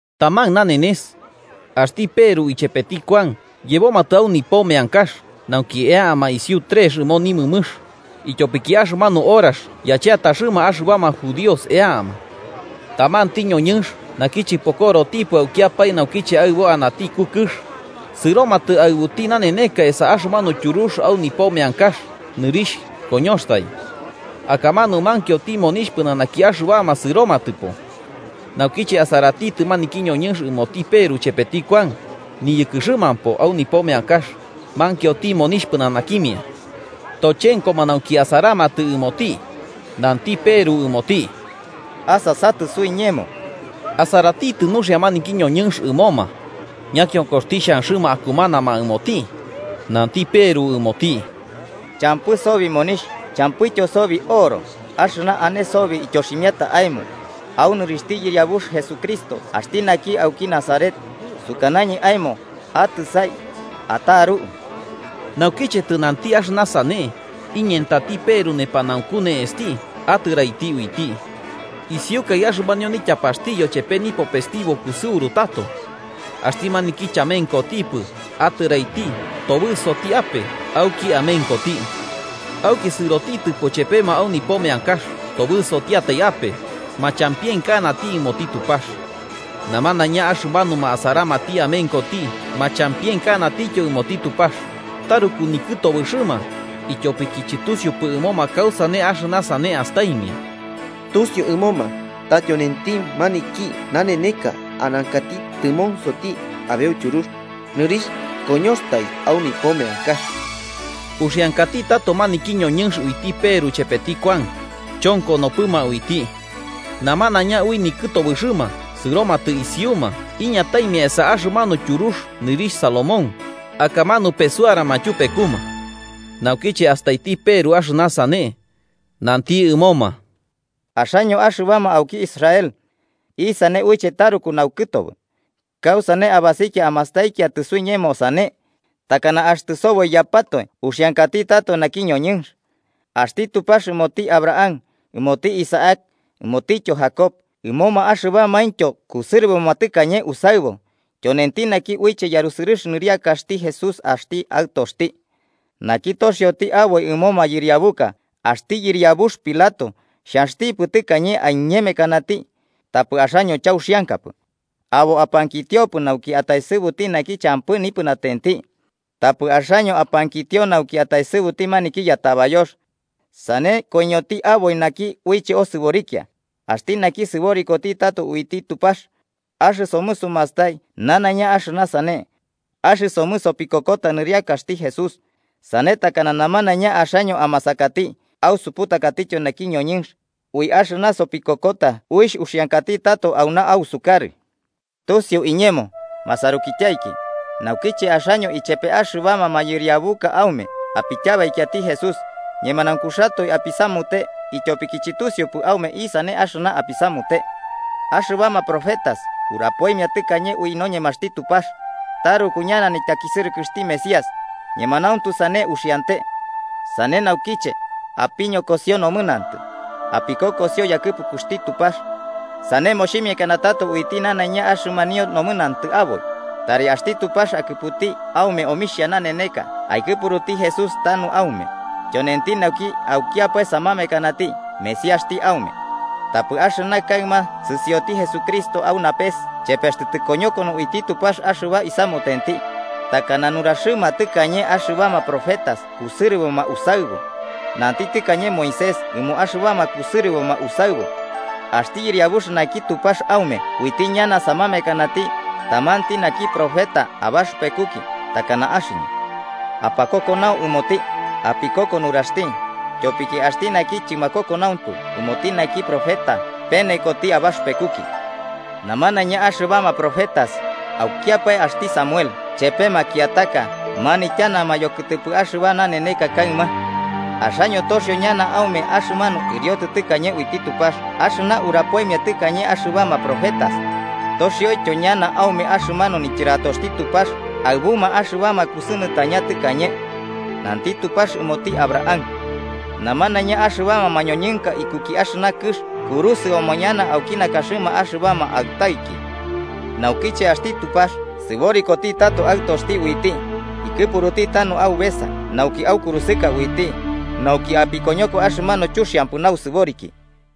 Taman nanenes, axti Peru ichepeti Kuan yebomatɨ au nipo meankax nauki eama isiu trex ɨmo nimɨmɨx, ityopiki axɨmanu horax yacheataxɨma axɨbama judíos eama. Tamanti ñoñɨnx naki chɨpokorotipɨ aukiapae naukiche aɨbo anati iku kɨx, sɨromatɨ aɨbuti naneneka esa axɨmanu tyurux au nipo meankax nɨrixh koñoxtai. Akamanu mankioti monixh pɨnanaki axɨbama sɨromatɨpo. Naukiche asaratitɨ maniki ñoñɨnx ɨmoti Peru chepeti Kuan, niyɨkɨxɨmampo au nipo meankax, mankioti monixh pɨnanakimia. Tochenkoma nauki asaramatɨ ɨmoti, nanti Peru ɨmoti: –Asasatɨ suiñemo. Asaratitɨ nuxia maniki ñoñɨnx ɨmoma, ñakionkoxti xhanxɨma akumanama ɨmoti. Nanti Peru ɨmoti: –Champɨ sobi monixh champɨityo sobi oro, axɨna ane sobi ityoximiata aemo: au nɨrixhti Yɨriabux Jesucristo axti naki auki Nazaret, sukanañɨ aemo, atɨsai, ataru. Naukiche tɨnanti axɨna sane, iñentati Peru nepanaunku ne'esti atɨraiti uiti. Isiukaɨ axɨmanio nityapaxti yochepe nipopesti bo kusɨuru tato. Axti maniki chamenkotipɨ atɨraiti tobɨsoti ape auki amenkoti. Auki sɨrotitɨpo ichepema au nipo meankax, tobɨsotiatai ape, machampienkanati ɨmoti Tupax. Namanaiña axɨmanuma asaramati amenkoti machampienkanatityo ɨmoti Tupax, taruku nikɨtobɨxɨma, ityopiki chɨtusiupɨ ɨmoma kausane axɨna sane astaimia. Tusiu ɨmoma, ta tyonenti maniki naneneka anankati tɨmonsoti abeu tyurux nɨrixh koñoxtai au nipo meankax. Uxiankati tato maniki ñoñɨnx uiti Peru chepeti Kuan, chonkonopɨma uiti. Namanaiña ui nikɨtobɨxɨma sɨromatɨ isiuma iñataimia esa axɨmanu tyurux nɨrixh Salomón, akamanu pesuarama tyupekuma. Naukiche astaiti Peru axɨna sane, nanti ɨmoma: “Axaño axɨbama auki Israel: ¿Isane uiche taruku naukɨtobɨ? ¿Kausane abasikia amastaikiatɨ suiñemo sane? ¿Takana axtɨ soboiyapatoe uxiankati tato naki ñoñɨnx? Axti Tupax ɨmoti Abraham, ɨmoti Isaac ɨmotityo Jacob, ɨmoma axɨbamaintyo kusɨrɨboma tɨkañe usaɨbu, tyonenti naki uiche yarusɨrɨx nɨrixhti Jesús axti Aɨtoxti. Naki toxioti aboi ɨmo mayɨriabuka, axti yɨriabux Pilato xhanxtipɨ tɨkañe aiñemekanati, tapɨ axaño chauxiankapɨ. Abo apankitiopɨ nauki ataesɨbuti naki champɨ nipɨnatenti, tapɨ axaño apankitio nauki ataesɨbuti maniki yatabayox. Sane koiñoti aboi naki uiche osɨborikia, axti naki sɨborikoti tato uiti Tupax, axɨsomɨ sumastai nanaiña axɨna sane. Axɨsomɨ sopikokota nɨriakaxti Jesús, sane takana namanaiña axaño amasakati ausuputakatityo naki ñoñɨnx, ui axɨna sopikokota uixh uxiankati tato auna ausukarɨ. “Tusiu iñemo, masarukityaiki, naukiche axaño ichepe axɨbama mayɨriabuka aume apityabaikiati Jesús, ñemanaunkuxatoe apisamute ityopiki chɨtusiupɨ aume isane axɨna apisamute. Axɨbama profetas urapoimia tɨkañe ui noñemaxti Tupax, taruku ñana nityakisɨrɨkɨxti Mesías, ñemanauntu sane uxiante. Sane naukiche, apiñokosio nomɨnantɨ, apikokosio yakɨpukuxti Tupax. Sane moximiakana tato uiti nanaiña axɨmanio nomɨnantɨ aboi, tari axti Tupax akɨputi aume omixha naneneka, aikɨpuruti Jesús tauna aume, tyonenti naki aukiapae samamekanati Mesíaxti aume. Tapɨ axɨna kaɨma sɨsioti Jesucristo au napes chepextɨ tɨmokoñokono uiti Tupax axɨba isamutenti, takana nuraxɨma tɨkañe axɨbama profetas kusɨrɨboma usaɨbu. Nanti tɨkañe Moisés ɨmo axɨbama kusɨrɨboma usaɨbu: ‘Axti Yɨriabux naki Tupax aume uiti ñana samamekanati tamanti naki profeta abaxɨpekuki takana axɨñɨ. Apakokonau ɨmoti apikoko nuraxti. Tyopiki axti naki chɨmakokonaumpɨ ɨmoti maniki profeta, penekoti abaxɨpekuki.’ “Namanaiña axɨbama profetas, aukiapae axti Samuel chepe makiataka manityanama yokɨtɨpɨ axɨba naneneka kaɨma. Axaño toxio ñana aume axɨmanu ɨriotɨ tɨkañe uiti Tupax axɨna urapoimia tɨkañe axɨbama profetas, toxioityo ñana aume axɨmanu nityɨratoxti Tupax aɨbuma axɨbama kusɨnɨtañama tɨkañe. Nanti Tupax ɨmoti Abraham: ‘Namanaiña axɨbama mañoñɨnka ikuki axɨna kɨx kurusɨoma ñana auki nakaxɨma axɨbama aɨtaiki.’ Naukiche axti Tupax sɨborikoti tato Aɨtoxti uiti, ikɨpuruti tanu aubesa nauki aukurusɨka uiti, nauki apikoñoko axɨmanu chuxiampɨ nausɨboriki.”